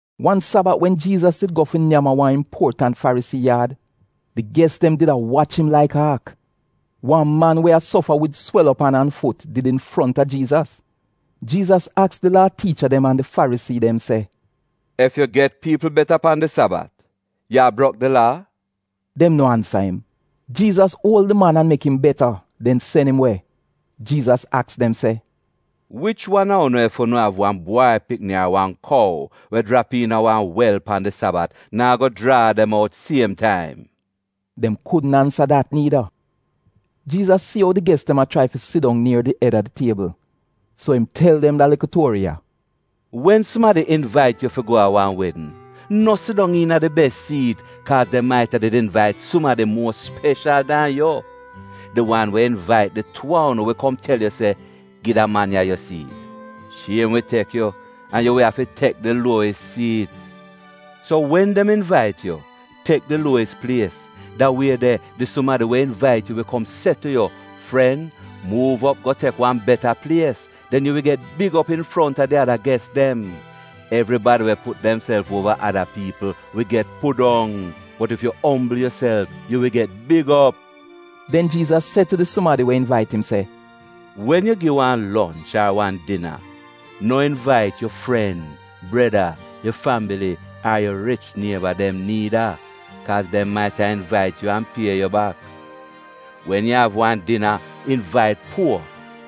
Wan Sabat, wen Jiizas did go fi nyam a wan impuotant Farisii yaad, di ges dem did a wach im laik aak. Wan man we a sofa wid swel op an an fut did infronta Jiizas. Jiizas aks di Laa tiicha dem an di Farisii dem se, “Ef yu get piipl beta pan di Sabat, yu a brok di laa?” Dem no ansa im. Jiizas uol di man an mek im beta, den sen im we. Jiizas aks dem se, “Wich wan a unu ef unu av wan bwai pikni ar wan kou we jrap iina wan wel pan di Sabat, naa go jraa dem out siem taim?” Dem kudn ansa dat niida. Jiizas si ou di ges dem a chrai fi sidong nier di ed a di tiebl, so im tel dem da likl tuori ya: “Wen sumadi invait yu fi go a wan wedn, no sidong iina di bes siit, kaaz dem maita did invait sumadi muo speshal dan yu. Di wan we invait di tuu a unu wi kom tel yu se, ‘Gi da man ya yu siit.’ Shiem wi tek yu an yu wi afi tek di luowis siit. So wen dem invait yu, tek di luowis plies, da wie de di sumadi we invait yu wi kom se tu yu, ‘Fren, muuv op go tek wan beta plies.’ Den yu wi get big op infronta di ada ges dem. Evribadi we put demself uova ada piipl, wi get pudong, bot ef yu ombl yuself, yu wi get big op.” Den Jiizas se tu di sumadi we invait im se, “Wen yu gi wan lonch ar wan dina, no invait yu fren, breda, yu fambili, ar yu rich nieba dem niida kaaz dem maita invait yu an pie yu bak. Wen yu av wan dina, invait puo,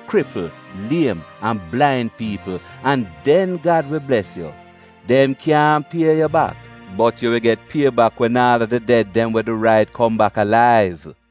kripl, liem an blain piipl an den Gad wi bles yu. Dem kyaahn pie yu bak, bot yu wi get pie bak wen aal a di ded dem we du rait kom bak alaiv.”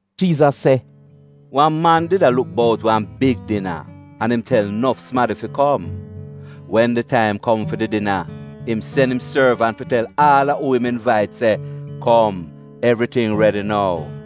Jiizas se, “Wan man did a luk bout wan big dina, an im tel nof sumadi fi kom. Wen di taim kom fi di dina im sen im sorvant fi tel aal a uu im invait se, ‘Kom, evriting redi nou.’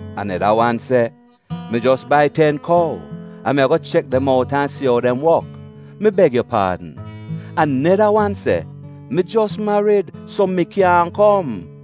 “Aneda wan se, ‘Mi jos bai ten kou, an mi ago chek dem out an si ou dem wok. Mi beg yu paadn.’ “Aneda wan se, ‘Mi jos marid, so mi kyaahn kom.’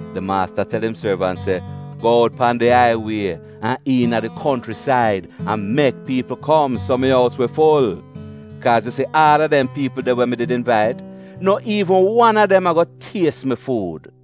“Di maasta tel im sorvant se, ‘Go out pan di aiwie an iina di konchrisaid an mek piipl kom, so mi ous wi ful. Kaaz yu si aal a dem piipl de we mi did invait, no iivn wan a dem ago ties mi fuud.’”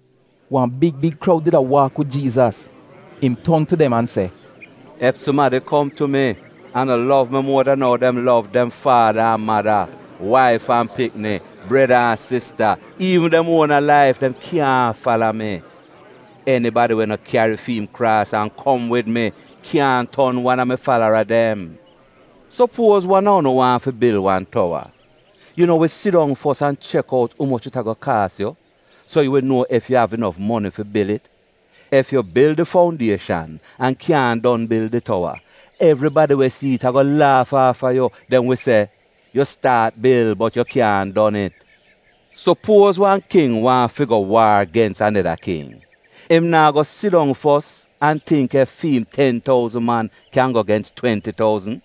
Wan big big kroud did a waak wid Jiizas. Im ton tu dem an se, “Ef sumadi kom tu mi an no lov mi muo dan ou dem lov dem faada an mada, waif an pikni, breda an sista, iivn dem uona laif, dem kyaahn fala mi. Enibadi we no kyari fi'im kraas an kom wid mi, kyaahn ton wan a mi falara dem. “Supuoz wan a unu waahn fi bil wan towa. Yu no wi sidong fos an chek out umoch it ago kaas yu, so yu wi nuo ef yu av inof moni fi bil it. Ef yu bil di foundieshan an kyaahn don bil di towa, evribadi we si it ago laaf aafa yu. Dem wi se, ‘Yu staat bil bot yu kyaahn don it.’ “Supuoz wan King waahn fi go waar gens aneda King. Im naa go sidong fos an tingk ef fi im ten touzn man, kyan go gens twenti touzn?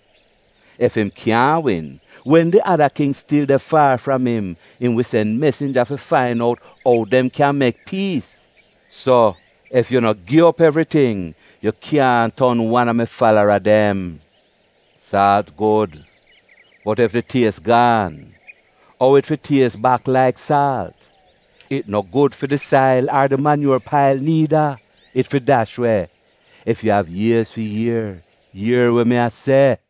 Ef im kyaahn win, wen di ada King stil de faar fram im, im wi sen mesinja fi fain out ou dem kyan mek piis. So, ef yu no gi op evriting, yu kyaahn ton wan a mi falara dem. “Saalt gud, bot ef di ties gaan, ou it fi ties bak laik saalt? It no gud fi di sail ar di manyuor pail niida, it fi dash we. Ef yu av iez fi ier, ier we mi a se.”